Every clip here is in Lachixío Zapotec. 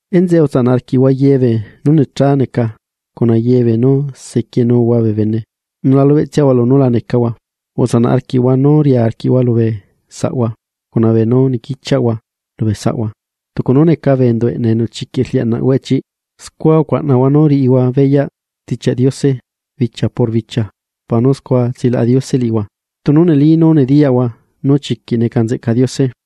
Enzeꞌe, utsanaꞌ arquiꞌhua ye beenú necha neca, cuna ye beenú sequienuhua bee bene, nu la lubeꞌtsiahua lunú la necahua, utsanaꞌ arquiꞌhua nú ria arquiꞌhua lubee saꞌhua, cuna beenú niquichiaꞌhua lubee saꞌhua. Tucu nú neca bee enduꞌ eꞌneꞌ enu chiquiꞌ rliaꞌnaꞌ hueꞌ chiꞌ, scua ucuaꞌnahua nú riꞌihua beyaꞌ Stichiaꞌ Diose bichia por bichia para nú scua tsilaꞌa Diose liꞌihua, tunu neli nú nediyaꞌhua nú chiquiꞌ nzeꞌca Diose.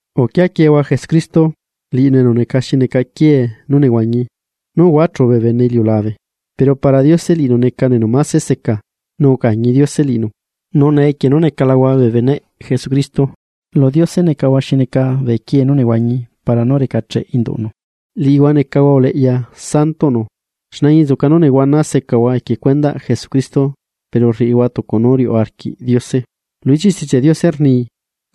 Uquiaquiehua Jesucristo, liꞌinu enu neca xi neca quiee nú nehuañi. Nú uhuachú bee bene iliulabe, pero para Diose liꞌinu necanu enu máse seca, nu ucañi Diose liꞌinu. Nu nee, equie nú necalahua bee beneꞌ Jesucristo, lu Diose necahua xi neca bee quiee nú nehuañi para nú recacheꞌ induꞌnu, liꞌihua necahua uleꞌya Santoꞌnu, xne añinzuca nú nehuana secahua equie cuendaꞌ Jesucristo pero rriꞌihua tucu nú riuꞌ arquiꞌ Diose. Lu ichiꞌ Stichiaꞌ Diose rni: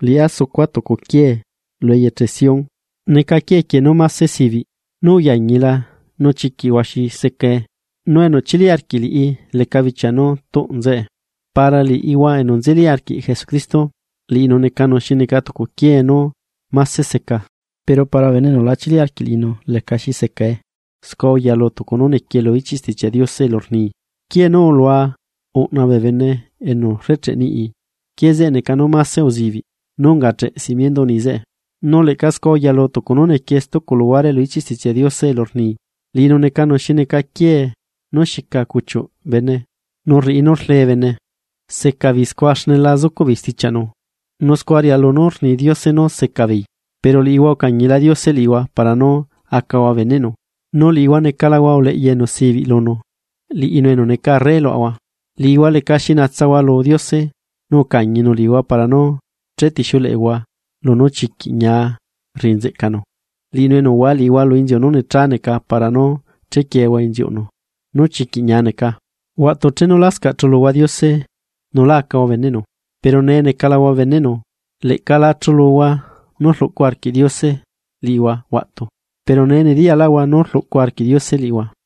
Liꞌá sucua tucu quiee eyeche Sión, neca quiee quieꞌ nú mase sibiꞌ, nú uyañila nú chiquiꞌ huaxi seca, nu enu chili arquiꞌ liꞌi leca bichia nú tuꞌ nzeꞌe. Para liꞌihua enu nzeli arquiꞌhua Jesucristo, liꞌinu necanu xi neca tucu quiee nú mase seca; pero para bee bene enu la chili arquiꞌ liꞌinu lecaxi seca nucuaꞌ, scua uyalu tucu nú nequie lu ichiꞌ Stichiaꞌ Diose elu rni: Quiee nu ulua uꞌna bee bene enu rrecheꞌe niꞌi, quiee zeꞌe neca nú máse uzibiꞌ nú ungacheꞌe simiendoꞌ niꞌi zeꞌe. Nu leꞌca scua uyalu tucu nú niquie stucu luhuare lu ichiꞌ Stichiaꞌ Diose elu rni: Liꞌinu necanu xi neca quiee nu xica cuchiuꞌ bene nu rriꞌi nú rle bene. Seca beei scua xne la zucuꞌ beei stichiaꞌnu, nu scua rialu nu rni Diose nú seca beei. Pero liꞌihua ucañila Diose liꞌihua para nú acahua beneꞌnu, nu liꞌihua necalahua uleꞌya enu sibiꞌ lunu, liꞌinu enu neca arre luaꞌahua. Liꞌihua lecaxi nahua lu Diose, nu ucañinu liꞌihua para nú chetixiuleꞌehua lunú chiquiꞌ ñia rriꞌi nzeꞌcanu, liꞌinu enu uhua liꞌihua lu inziu nú necha neca para nú chequiehua inziuꞌnu nú chiquiꞌ ñia neca. Huaꞌtu chenu lascaꞌ chuluhua Diose nu lá acahua beneꞌnu, pero nee necalahua beneꞌnu, leꞌca lá chuluhua nú rluꞌcu arquiꞌ Diose liꞌihua huaꞌtu, pero nee nediyaꞌhua nú rluꞌcu arquiꞌ Diose liꞌihua.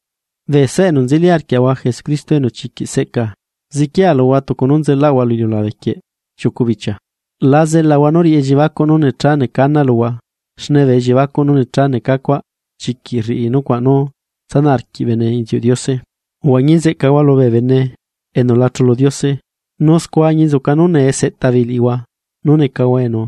Bee saꞌa enu nzeli arquiaꞌahua Jesucristo enu chiquiꞌ seꞌca, ziquia luhua tucu nú nzelaꞌahua lu iliulabe quieꞌ chiucu bichia, la tsanaꞌhua nu riꞌi elliebacuꞌ nú necha neca ana luhua, xne bee elliebacuꞌ nú necha neca cuaꞌ chiquiꞌ rriꞌi nucuaꞌ nú tsanaꞌ arquiꞌ bene inziuꞌ Diose. Uhuañi nzeꞌcahua lubee bene enu la chulu Diose. Nu scua añinzuca nú nee seꞌta beei liꞌihua nú necahua enu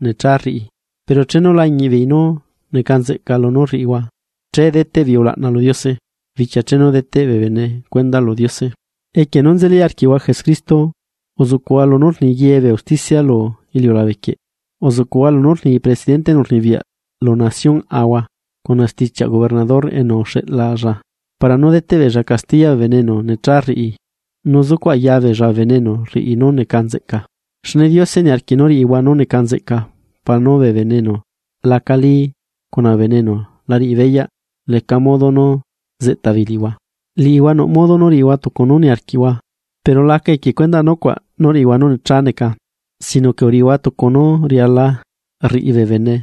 necha rriꞌi, pero chenu lañiꞌbeei nu neca nzeꞌca lunú rriꞌihua che deteꞌ beei ulaꞌna lu Diose bichia chenu deteꞌ bee bene cuenda lu Diose. Equie nú nzeli arquiꞌhua Jesucristo uzuꞌcuꞌhua lunú rni ye bee usticia lu iliulabe quieꞌ. Uzuꞌcuꞌhua lunú rni presidente enu rnibiyaꞌ lu naciónꞌhua, cuna stichiaꞌ gobernador enu uxeꞌlalla para nú deteꞌ beella castiya bee enu necha rriꞌi nu zucuꞌ aya beella bee bene enu rriꞌi nú neca nzeꞌca. Xne Diose niarquiꞌ nú riꞌihua nú neca nzeꞌca para nú bee enu lacali cuna bee enu la riꞌi beyaꞌ leca modo nú zeꞌta beei liꞌihua. Liꞌihua nuꞌ modo riꞌihua tucu nú niarquiꞌhua, pero la aca equie cuendaꞌ nucuaꞌ nú riꞌihua nú necha neca sino que uriꞌihua tucu nú riala rriꞌi bee bene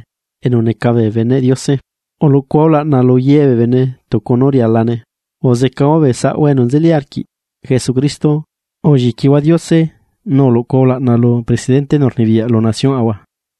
enu neca bee beneꞌ Diose. Uluꞌcuhua ulaꞌna lu ye bee bene tucu nu rialane. Uzecahua bee saꞌahua enu nzeli arquiꞌ Jesucristo, ulliquihua Diose, nu uluꞌcuhua ulaꞌna lu presidente enu rnibiyaꞌ lu naciónꞌhua.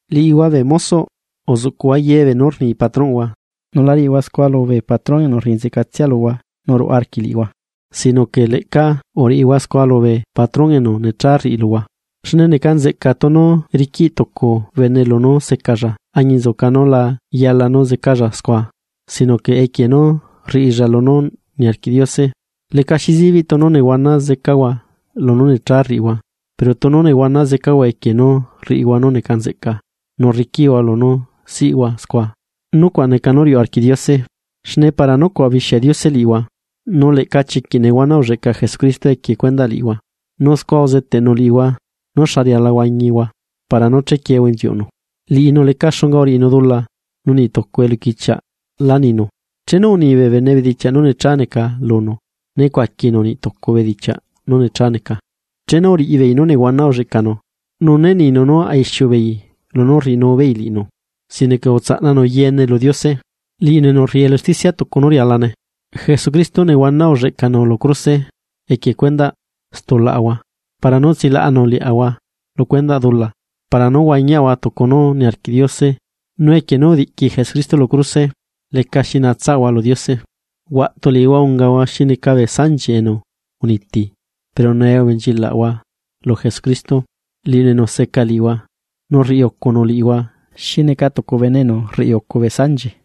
Liꞌihua bee mozoꞌ, uzuꞌcuꞌhua ye beenú rni patronꞌhua, nu la riꞌihua scua lubee patron enu rriꞌi nzeꞌcatsia luhua nu ruꞌa arquiꞌ liꞌihua, sino que leꞌca uriꞌihua scua lubee patrón enu necha rriꞌi luhua. Xne neca nzeꞌca tunu riquiꞌ tucu bene lunú zecalla añinzuca nu la yala nu zecalla scua, sino que equie nú rriꞌilla lunú niarquiꞌ Diose. Lecaxi zibiꞌ tunu nehuana zecahua lunú necha rriꞌihua, pero tunu nehuana zecahua equie nú rriꞌihua nú neca nzeꞌca nu rriquiꞌhua lunú nehuana secahua scua, nucuaꞌ riuꞌ arquiꞌ Diose. Xne para nucuaꞌ ubixia Diose liꞌihua, nu leꞌca chiquiꞌ nehuana ulleꞌca Jesucristo equie cuendaꞌ liꞌihua, nu scua uzeteꞌnu liꞌihua nú xa riala huañihua para nú chequiehua inziuꞌnu. Liꞌinu leca xunga uriꞌinu dula, nu niꞌ tucu eluquichiaꞌ lá ninu. Chenu uni bee bene bedichiaꞌ nu necha neca lunu, né cuaquinu niꞌtucu bedichiaꞌ nú necha neca, chenu uriꞌi beei nú nehuana ulleꞌcanu, nu né ninu nú a ixiu beei lunú rriꞌinu beei liꞌinu, sino que utsaꞌnanu yeene lu Diose, liꞌinu enu rriꞌi elu usticia tucu nú rialane. Jesucristo nehuana ulleꞌcanu lu cruse equie cuendaꞌ stulaꞌahua para nú tsilaꞌanu liaꞌahua lu dula para nú huañiaꞌahua tucu nú niarquiꞌ Diose nu equie nú udiꞌqui Jesucristo lu cruse, lecaxi naꞌahua lu Diose. Huaꞌtu liꞌihua ungahua xi neca bee sanchi enu uniti, pero nee ubenchilaꞌhua lu Jesucristo, liꞌinu enu seca liꞌihua nu rriucunu liꞌihua xi neca tucu bene enu rriucu bee sanchi.